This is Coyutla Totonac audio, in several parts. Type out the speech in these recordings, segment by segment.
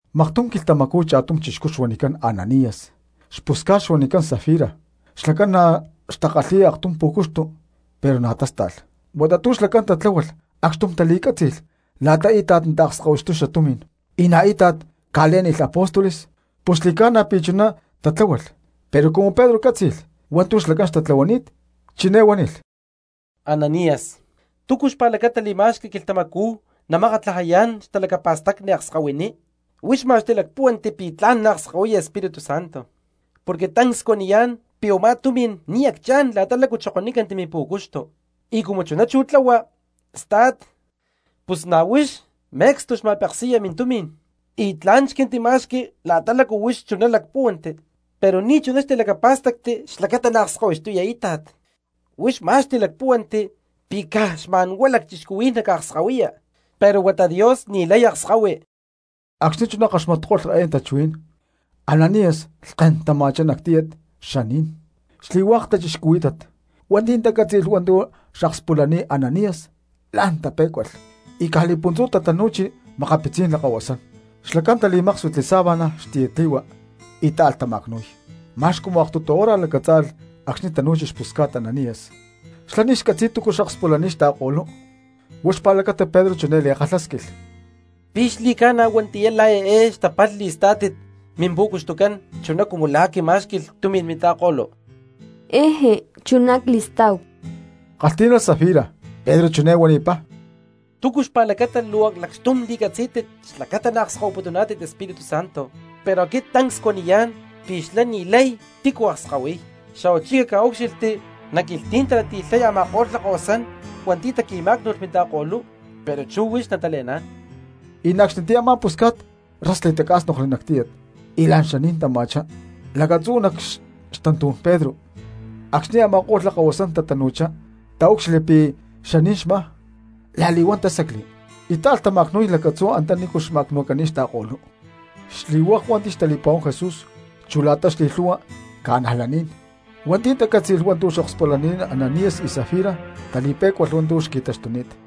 Maktum quilhtamacú cha̠tum chixcú xuanicán Ananías xpusca̠t xuanicán Safira xlacán na̠ xtakalhi̠y aktum pú̠cuxtu pero na̠ tásta̠lh. Huata tu̠ xlacán tatláhualh acxtum tali̠cátzi̠lh la̠qui̠ íta̠t naakskahuixtuy tumi̠n y na̠ íta̠t naca̠le̠niy apóstoles, pus xli̠ca̠na pi̠ chuná tatlahualh. Pero cumu Pedro cátzi̠lh hua̠ntu̠ xlacán xtatlahuani̠t, chiné huánilh: —Ananías, ¿túcu xpa̠lacata li̠ma̠xqui quilhtamacú namakatlajayá̠n xtalacapa̠stacni akskahuiní? Huix ma̠x tilacpuhuántit pi̠ tla̠n naakskahuiya Espíritu Santo porque tancs cuaniyá̠n pi̠ u̠má tumi̠n ni̠ acchá̠n la̠ta lácu xokonícanti mimpu̠cuxtu. Y cumu chuná chú tlahua sta̠t, pus na̠ huix me̠cstu xma̠peksi̠ya mintumi̠n y tla̠n xquintima̠xqui la̠ta lácu huix chuná lacpúhuanti, pero ni̠chuná xtilacapá̠stacti xlacata naakskahuixtuya íta̠t. Huix ma̠x tilacpúhuanti pi̠ caj xma̠nhuá lacchixcuhuí̠n naca̠akskahuiya, pero huata Dios ni̠lay akskahui. Acxni̠ chuná kaxmatko̠lh eé tachuhuí̠n Ananías lhkén tama̠chá nac tíyat xaní̠n. Xli̠hua̠k cristianos hua̠nti̠ tacátzi̠lh hua̠ntu̠ akspúlalh Ananías la̠n tapé̠cualh. Y caj li̠puntzú tatanu̠chi makapitzí̠n lakahuasán, xlacán tali̠máksuitli sábana xtiyatli̠hua y táalh tama̠cnu̠y. Ma̠x cumu aktutu hora lacatzá̠lalh acxni̠ tanu̠chi xpusca̠t Ananías, xlá ni̠ xcatzi̠y túcu xakspulani̠t xta̠ko̠lú. Huá xpa̠lacata Pedro chiné li̠kalhásquilh: —¿Pi̠ xli̠ca̠na huatiyá la̠ eé xtapalh li̠stá̠tit mimpu̠cuxtucán chuná cumu la̠ quimá̠xqui̠lh tumi̠n minta̠ko̠lú? —¡Jeje, chuná cli̠stá̠hu! —kalhtí̠nalh Safira. Pedro chiné huanipá: —¿Túcu xpa̠lacata luu lacxtum la̠li̠catzí̠tit xlacata naakskahuiputuná̠tit Espíritu Santo? Pero aquit tancs cuaniyá̠n pi̠ xlá ni̠lay tícu akskahuiy, xa̠huachí caca̠úcxilhti nac quilhtí̠n talati̠lhay a̠ma̠ko̠lh lakahuasán hua̠nti̠ taqui̠má̠cnu̠lh minta̠ko̠lú, pero chú huix natale̠ná̠n. Y na̠ acxnitiyá a̠ma̠ pusca̠t rás li̠tacá̠snokli nac tíyat y la̠n xaní̠n tama̠chá lacatzú nac xtantú̠n Pedro. Acxni̠ a̠ma̠ko̠lh lakahuasán tatanu̠chá taúcxilhli pi̠ xaní̠n xmá, la̠li̠huán tásacli y táalh tama̠cnu̠y lacatzú antanícu xtama̠cnu̠ni̠t xta̠ko̠lú. Xli̠hua̠k hua̠nti̠ xtali̠pa̠huán Jesús chu la̠ta xli̠lhu̠hua cristianos hua̠nti̠ tacátzi̠lh hua̠ntu̠ xakspulani̠t Ananías y Safira tali̠pé̠cualh hua̠ntu̠ xqui̠taxtuni̠t.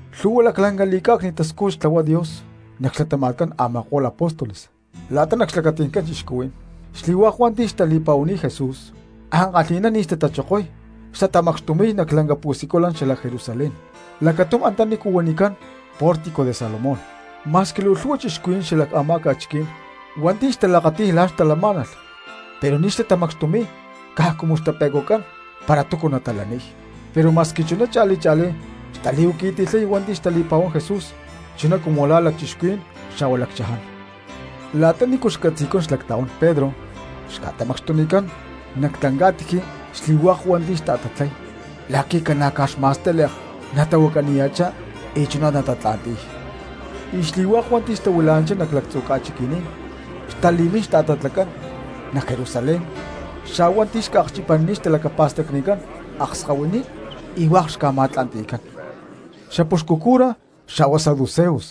Lhu̠hua laclanca li̠cá̠cni̠t tascújut xtlahuay Dios nac xlatama̠tcán a̠ma̠ko̠lh apóstoles la̠ta nac xlacati̠ncán cristianos. Xli̠hua̠k hua̠nti̠ xtali̠pa̠huani̠t Jesús ankalhi̠ná ni̠ xtatachokoy xtatamacxtumi̠y nac lanca pu̠siculan xalac Jerusalén lacatum antaní huanicán Pórtico de Salomón. Ma̠squi luu lhu̠hua cristianos xala a̠má ca̠chiquí̠n hua̠nti̠ xtalakati̠y la̠ xtalamá̠nalh pero ni̠ xtatamacxtumi̠y caj cumu xtape̠cuán para túcu natalaniy. Pero ma̠squi chuná cha̠li cha̠lí xtali̠huaqui̠ti̠lhay hua̠nti̠ xtali̠pa̠huán Jesús chuná cumu la̠ lacchixcuhuí̠n xa̠hua lacchaján. La̠ta nícu xcatzi̠cán xlactla̠huán Pedro xca̠tamacxtucán nac tlanca̠tiji xli̠hua̠k hua̠nti̠ xtata̠tatlay la̠qui̠ ca̠na̠caj xma̠stíle̠k natahuacaniya̠chá y chuná natatatla̠nti̠y. Y xli̠hua̠k hua̠nti̠ xtahuila̠nanchá nac lactzu̠ ca̠chiqui̠ní̠n, xtali̠mín xta̠tatlacán nac Jerusalén xa̠hua hua̠nti̠ xca̠akchipanini̠t xtalacapa̠stacnicán akskahuiní, y hua̠k xca̠ma̠tla̠nti̠cán. Xapuxcu cura xa̠hua saduceos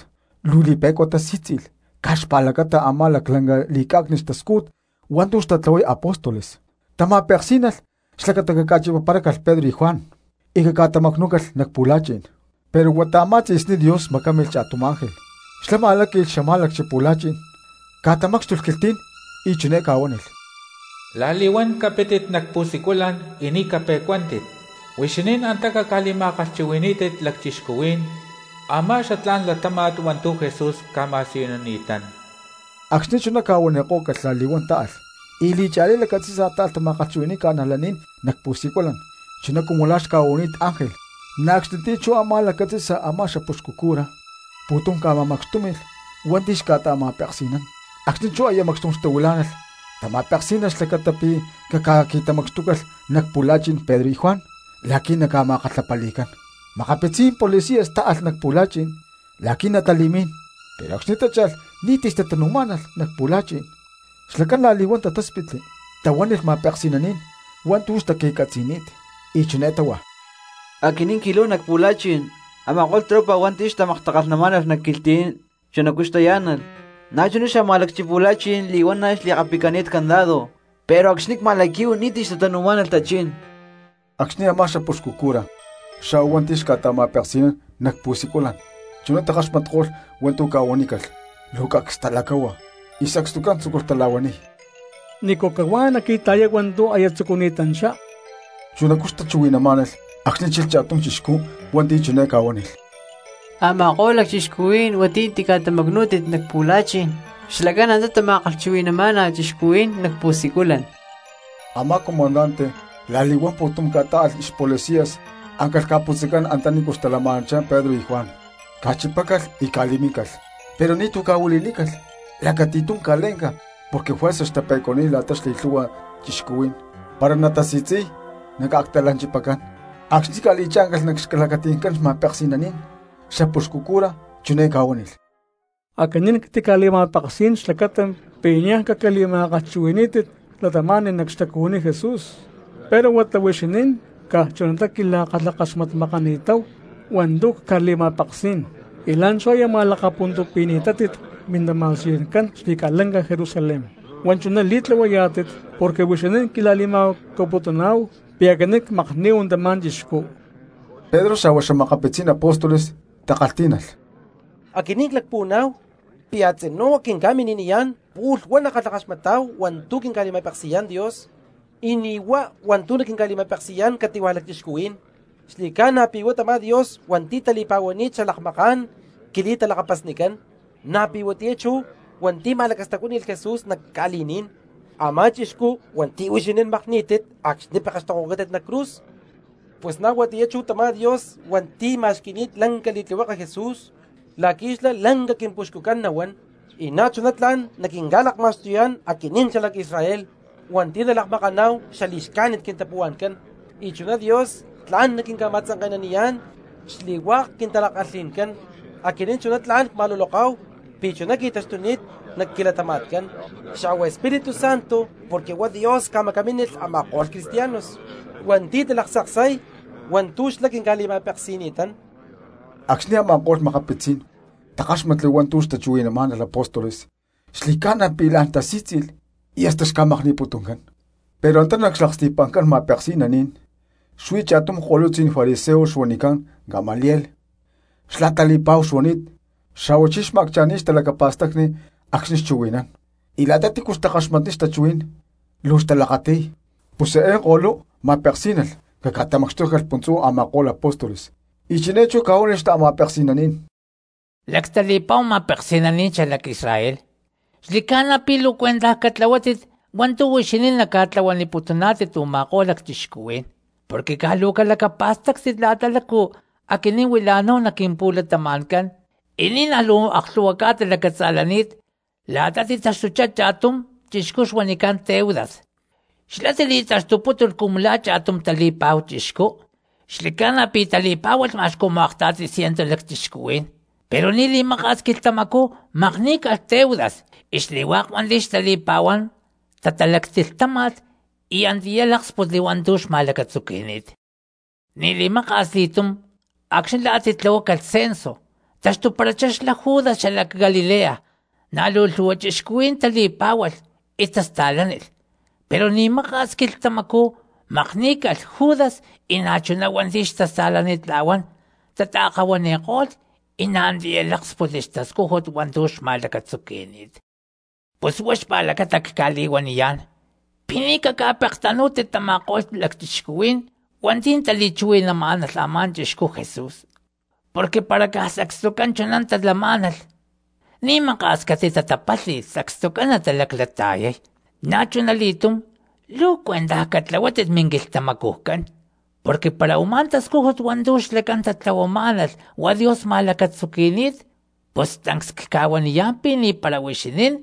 luu li̠pe̠cua tali̠sí̠tzi̠lh caj xpa̠lacata a̠má laclanca li̠cá̠cni̠t tascújut hua̠ntu̠ xtatlahuay apóstoles. Tama̠peksí̠nalh xlacata caca̠chipaparácalh Pedro y Juan y catamacnú̠calh nac pu̠la̠chi̠n. Pero huata a̠má tzi̠sní Dios macámilh cha̠tum xángel xlá ma̠láqui̠lh xamá̠lacchi pu̠la̠chi̠n, ca̠tamácxtulh quilhtí̠n y chiné ca̠huánilh: —La̠li̠huán capítit nac pu̠siculan y ni̠ cape̠cuántit, huixinín antá caca̠li̠ma̠kalhchuhui̠ní̠tit cristianos a̠má xatlá̠n latáma̠t hua̠ntu̠ Jesús ca̠ma̠siyunini̠tán. Acxni̠ chuná ca̠huanikó̠calh la̠li̠huán táalh y li̠cha̠lí lacatzi̠sa táalh tama̠kalhchuhui̠ni̠y cristianos nac pu̠siculan chuná cumu la̠ xca̠huanini̠t ángel. Na̠ acxnitiyá chú a̠má lacatzi̠sa a̠má xapuxcu cura pu̠tum ca̠ma̠macxtúmi̠lh hua̠nti̠ xca̠ta̠ma̠peksi̠nán, acxni̠ chú aya macxtum xtahuilá̠nalh tama̠peksí̠nalh xlacata pi̠ caca̠qui̠tamacxtúcalh nac pu̠la̠chi̠n Pedro y Juan la̠qui̠ naca̠ma̠kalhapali̠cán. Makapitzí̠n policias táalh nac pu̠la̠chi̠n la̠qui̠ natali̠mín, pero acxni̠ tácha̠lh ni̠ti̠ xtatanu̠má̠nalh nac pu̠la̠chi̠n; xlacán la̠li̠huán tatáspitli tahuánilh ma̠peksi̠naní̠n hua̠ntu̠ xtaqui̠catzi̠ni̠t; y chiné táhua: —Aquinín cqui̠láhu nac pu̠la̠chi̠n, a̠ma̠ko̠lh tropa hua̠nti̠ xtamaktakalhnamá̠nalh nac quilhtí̠n chunacú xtayá̠nalh, na̠chuná xamá̠lacchipu̠la̠chi̠n li̠huana̠ li̠kapicani̠t candado pero acxni̠ cma̠laquí̠hu ni̠ti̠ xtatanu̠má̠nalh a̠ma̠ko̠lh tachí̠n. Acxni̠ a̠má xapuxcu cura xa̠hua hua̠nti̠ xca̠ta̠ma̠peksi̠nán nac pu̠siculan, chuná takaxmatko̠lh hua̠ntu̠ ca̠huanícalh luu cacs talacáhua y sacstucán tzúculh tala̠huaniy: —¿Nícu cahuá naqui̠ta̠yay hua̠ntu̠ aya tzucuni̠tanchá? Chunacú xtachuhui̠namá̠nalh acxni̠ chilh cha̠tum chixcú hua̠nti̠ chiné ca̠huánilh: —Ama̠ko̠lh lacchixcuhuí̠n hua̠nti̠ tica̠ma̠tamacnu̠ni̠nántit nac pu̠la̠chi̠n, xlacán antá tama̠kalhchuhui̠ni̠má̠nalh cristianos nac pu̠siculan. Amá comandante la̠li̠huán pu̠tum ca̠tá̠alh xpolicias áncalh ca̠putzacán antanícu xtalama̠nanchá Pedro y Juan, ca̠chipácalh y ca̠li̠míncalh, pero ni̠tu̠ ca̠huili̠nícalh lacati̠tum ca̠lé̠nca porque juerza xtape̠cuaniy la̠ta xli̠lhu̠hua cristianos para natasi̠tzi̠y y naca̠actalanchipacán. Acxni̠ ca̠li̠chá̠ncalh nac xlacati̠ncán ma̠peksi̠naní̠n, xapuxcu cura chiné ca̠huánilh: —Aquinín ctica̠li̠ma̠peksí̠n xlacata pi̠ niaj caca̠li̠ma̠kalhchuhui̠ní̠tit cristianos nac xtacuhuiní Jesús, pero huata huixinín caj chunatá quila̠kalhakaxmatmakani̠táhu hua̠ntu̠ cca̠li̠ma̠peksí̠n y la̠nchú aya ma̠lakapuntupi̠ni̠tátit mintama̠siycán xli̠ca̠lanca Jerusalén; huá chuná li̠tlahuayá̠tit porque huixinín quila̠li̠ma̠huacaputuná̠hu pi̠ aquinín cmakní̠hu tamá chixcú. Pedro xa̠hua xa̠makapitzí̠n apóstoles takalhtí̠nalh: —Aquinín cpuhuaná̠hu pi̠ a̠tzinú quinca̠mini̠niyá̠n pu̠lh huá nackalhakaxmatá̠hu hua̠ntu̠ naquinca̠li̠ma̠peksi̠yá̠n Dios y ni̠huá hua̠ntu̠ naquinca̠li̠ma̠peksi̠yá̠n cati̠hua̠ lacchixcuhuí̠n. Xli̠ca̠na pi̠ huá tamá Dios hua̠nti̠ tali̠pa̠huani̠t xalakmaká̠n quili̠talakapasnicán, na̠ pi̠huatiyá chú hua̠nti̠ ma̠lacastacuáni̠lh Jesús nac ca̠li̠ní̠n, a̠má chixcú hua̠nti̠ huixinín makní̠tit acxni̠ pekextokohuacátit nac cruz. Pus na̠ huatiyá chú tamá Dios hua̠nti̠ ma̠xqui̠ni̠t lanca li̠tlihueke Jesús la̠qui̠ xlá lanca quimpuxcucán nahuán y na̠chuná tla̠n naquinca̠lakma̠xtuyá̠n aquinín xalac Israel hua̠nti̠ nalakmakaná̠hu xali̠xcájnit quintapuhua̠ncán y chuná Dios tla̠n naquinca̠ma̠tzanke̠naniyá̠n xli̠hua̠k quintala̠kalhi̠ncán. Aquinín chuná tla̠n cma̠luloká̠hu pi̠ chuná qui̠taxtuni̠t nac quilatama̠tcán, xa̠hua Espíritu Santo porque huá Dios ca̠macamínilh a̠ma̠ko̠lh cristianos hua̠nti̠ talaktzaksay hua̠ntu̠ xlá quinca̠li̠ma̠peksi̠ni̠tán. Acxni̠ a̠ma̠ko̠lh ma̠peksi̠naní̠n takáxmatli hua̠ntu̠ tachuhuí̠nalh apóstoles xli̠ca̠na pi̠ la̠n tasí̠tzi̠lh y hasta xca̠makni̠putuncán. Pero antá nac xlaksti̠pa̠ncán ma̠peksi̠naní̠n xuí cha̠tum ko̠lutzí̠n fariseo xuanicán Gamaliel xlá tali̠pa̠hu xuani̠t xa̠huachí xma̠accha̠ni̠y xtalacapa̠stacni acxni̠ xchuhui̠nán, y la̠ta tícu xtakaxmatniy xtachuhuí̠n luu xtalakati̠y. Pus eé ko̠lú ma̠peksí̠nalh caca̠tamacxtúcalh puntzú a̠ma̠ko̠lh apóstoles, y chiné chú ca̠huánilh xta̠ma̠peksi̠naní̠n: —Lactali̠pa̠hua ma̠peksi̠naní̠n xalac Israel: xli̠ca̠na pi̠ luu cuentaj catlahuátit hua̠ntu̠ huixinín naca̠tlahuaniputuná̠tit u̠ma̠ko̠lh lacchixcuhuí̠n. Porque caj luu calacapa̠stáctit la̠ta lácu aquinín huila̠náhu nac quimpu̠latama̠ncán, y ni̠naj luu aklhu̠hua ca̠ta lacatza̠lani̠t la̠ta titaxtuchá cha̠tum chixcú xuanicán Teudas, xlá tili̠taxtupútulh cumu la̠ cha̠tum tali̠pa̠hu chixcú; xli̠ca̠na pi̠ tali̠pá̠hualh ma̠x cumu akta̠ti cientu lacchixcuhuí̠n. Pero ni̠ li̠maka̠s quilhtamacú makní̠calh Teudas y xli̠hua̠k hua̠nti̠ xtali̠pa̠huán tatalactilhtáma̠lh y antiyá láksputli hua̠ntu̠ xma̠lacatzuqui̠ni̠t. Ni̠ li̠maka̠s li̠túm acxni̠ la̠ a̠ titlahuácalh census taxtuparachá xlá Judas xalac Galilea, na̠ luu lhúhua cristianos tali̠pá̠hualh y tasta̠lánilh, pero ni̠ maka̠s quilhtamacú makní̠calh Judas y na̠chuná hua̠nti̠ xtasta̠lanitla̠huán tataakahuani̠ko̠lh y na̠ antiyá láksputli xtascújut hua̠ntu̠ xma̠lacatzuqui̠ni̠t. Pus huá xpa̠lacata cca̠li̠huaniyá̠n pi̠ ni̠ caca̠pektanú̠tit tama̠ko̠lh lacchixcuhuí̠n hua̠nti̠ tali̠chuhui̠namá̠nalh a̠má chixcú Jesús, porque para caj sacstucán chuná talamá̠nalh ni̠ maka̠s catitatapálhi̠lh sacstucán natalaclata̠yay. Na̠chunali̠túm luu cuentaj catlahuátit minquilhtamacujcán, porque para u̠má tascújut hua̠ntu̠ xlacán tatlahuamá̠nalh huá Dios ma̠lacatzuqui̠ni̠t pus tancs cca̠huaniyá̠n pi̠ ni̠para huixinín,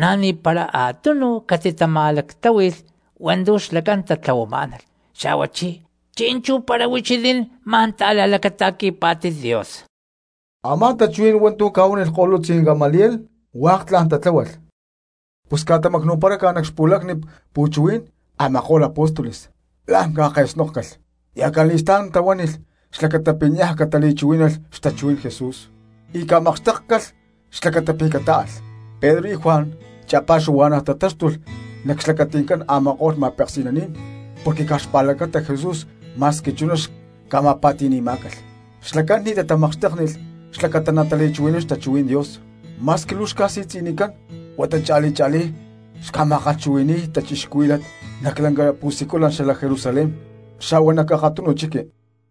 na̠ ni̠para a̠tunu catitama̠lactláhui̠lh hua̠ntu̠ xlacán tatlahuamá̠nalh. Xa̠huachí, ¿chi̠nchú para huixinín ma̠n ta̠la̠lacata̠qui̠pá̠tit Dios? Amá tachuhuí̠n hua̠ntu̠ ca̠huánilh ko̠lutzí̠n Gamaliel hua̠k tla̠n tatláhualh. Pus ca̠tamacnu̠paráca nac xpu̠lacni pu̠chuhuí̠n a̠ma̠ko̠lh apóstoles, la̠n ca̠ke̠snókcalh y acali̠stá̠n tahuánilh xlacata pi̠ niaj catali̠chuhuí̠nalh xtachuhuí̠n Jesús, y ca̠makxtékcalh xlacata pi̠ catáalh. Pedro y Juan cha̠pa̠xuhua̠na̠ tatáxtulh nac xlacati̠ncán a̠ma̠ko̠lh ma̠peksi̠naní̠n porque caj xpa̠lacata Jesús ma̠squi chuná xca̠ma̠pa̠ti̠ni̠má̠calh. Xlacán ni̠ tatamakxtéknilh xlacata natali̠chuhui̠nán xtachuhuí̠n Dios, ma̠squi luu xca̠si̠tzi̠nicán, huata cha̠li cha̠lí xtama̠kalhchuhui̠ni̠y cristianos nac lanca pu̠siculan xalac Jerusalén xa̠hua nac akatunu chiqui.